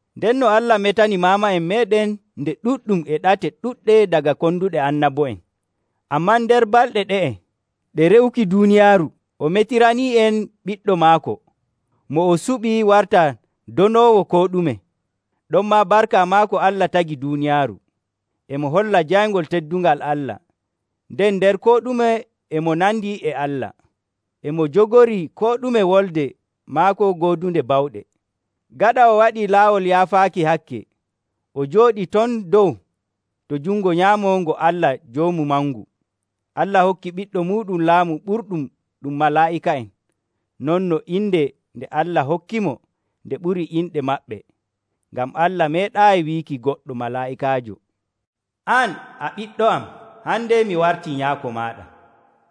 Ndenno Allah metanii maama'en meeɗen nde ɗuɗɗum e ɗate ɗuɗɗe daga konduɗe annabo'en. Ammaa nder balɗe ɗe'e ɗe re'uki duuniyaaru o metiranii'en Ɓiɗɗo maako, mo o suɓi warta donoowo koo ɗume. Ɗonmaa barka maako Allah tagi duuniyaaru. E mo holla jayngol teddungal Allah, nden nder koo ɗume e mo nandi e Allah. E mo jogorii koo ɗume wolde maako goodunde bawɗe. Gaɗa o waɗii laawol yaafaaki hakke, o jooɗii ton dow to jungo nyaamo ngo Allah Joomu Mangu. Allah hokkii Ɓiɗɗo muuɗum laamu ɓurɗum ɗum malaa'ika'en, non no inde nde Allah hokkimo nde ɓurii inɗe maɓɓe. Ngam Allah meeɗaayi wiiki goɗɗo malaa'ikaajo, “An, a ɓiɗɗo am, hande mi wartii Nyaako maaɗa.”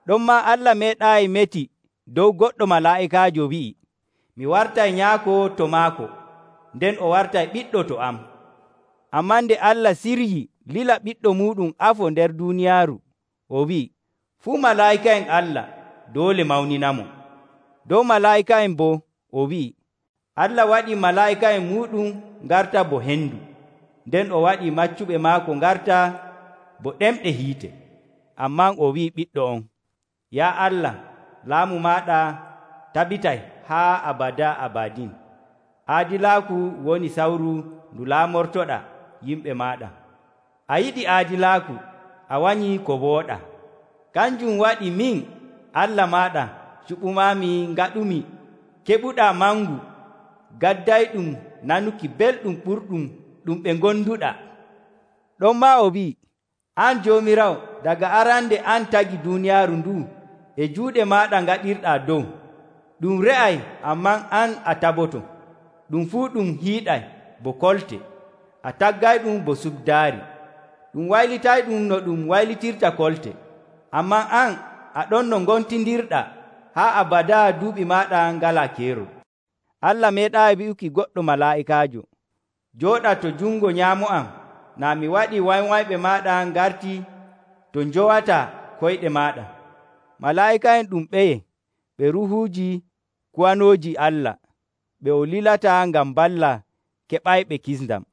Ɗonmaa Allah meeɗaayi meti dow goɗɗo malaa'ikaajo wi'i, “Mi wartay Nyaako to maako, nden o wartay ɓiɗɗo to am.” Ammaa nde Allah siryii lila Ɓiɗɗo muuɗum afo nder duuniyaaru, o wi'ii, “Fuu malaa'ika'en Allah doole mawninamo.” Dow malaa'ika'en boo, o wi'ii, “Allah waɗii malaa'ika'en muuɗum ngarta bo hendu, nden o waɗii maccuɓe maako ngarta bo ɗemɗe hiite.” Ammaa o wi'ii Ɓiɗɗo on, “Yaa Allah, laamu maaɗa tabitay haa abadaa abadin. Aadilaaku woni sawru ndu laamortoɗaa yimɓe maaɗa. A yiɗi aadilaaku, a wanyii ko wooɗaa. Kanjum waɗi min, Allah maaɗa, cuɓumaami ngaɗumi keɓuɗaa mangu gaddayɗum nanuki belɗum ɓurɗum ɗum ɓe ngonduɗaa.” Ɗonmaa o wi'ii, “An Joomiraawo, daga arande an tagi duuniyaaru ndu'u, e juuɗe maaɗa ngaɗirɗaa dow. Ɗum re'ay, ammaa an a taboto. Ɗum fuu ɗum hiiɗay bo kolte. A taggayɗum bo cuddaari, ɗum waylitayɗum no ɗum waylitirta kolte. Ammaa an, a ɗon no ngontindirɗaa, haa abadaa duuɓi maaɗa ngalaa keerol.” Allah meeɗaayi wi'uki goɗɗo malaa'ikaajo, “Jooɗa to jungo nyaamo am naa mi waɗii wanywanyɓe maaɗa ngartii to njowataa koyɗe maaɗa.” Malaa'ika'en ɗum ɓeye? Ɓe ruuhuuji kuwanooji Allah ɓe o lilata ngam mballa keɓayɓe kisndam.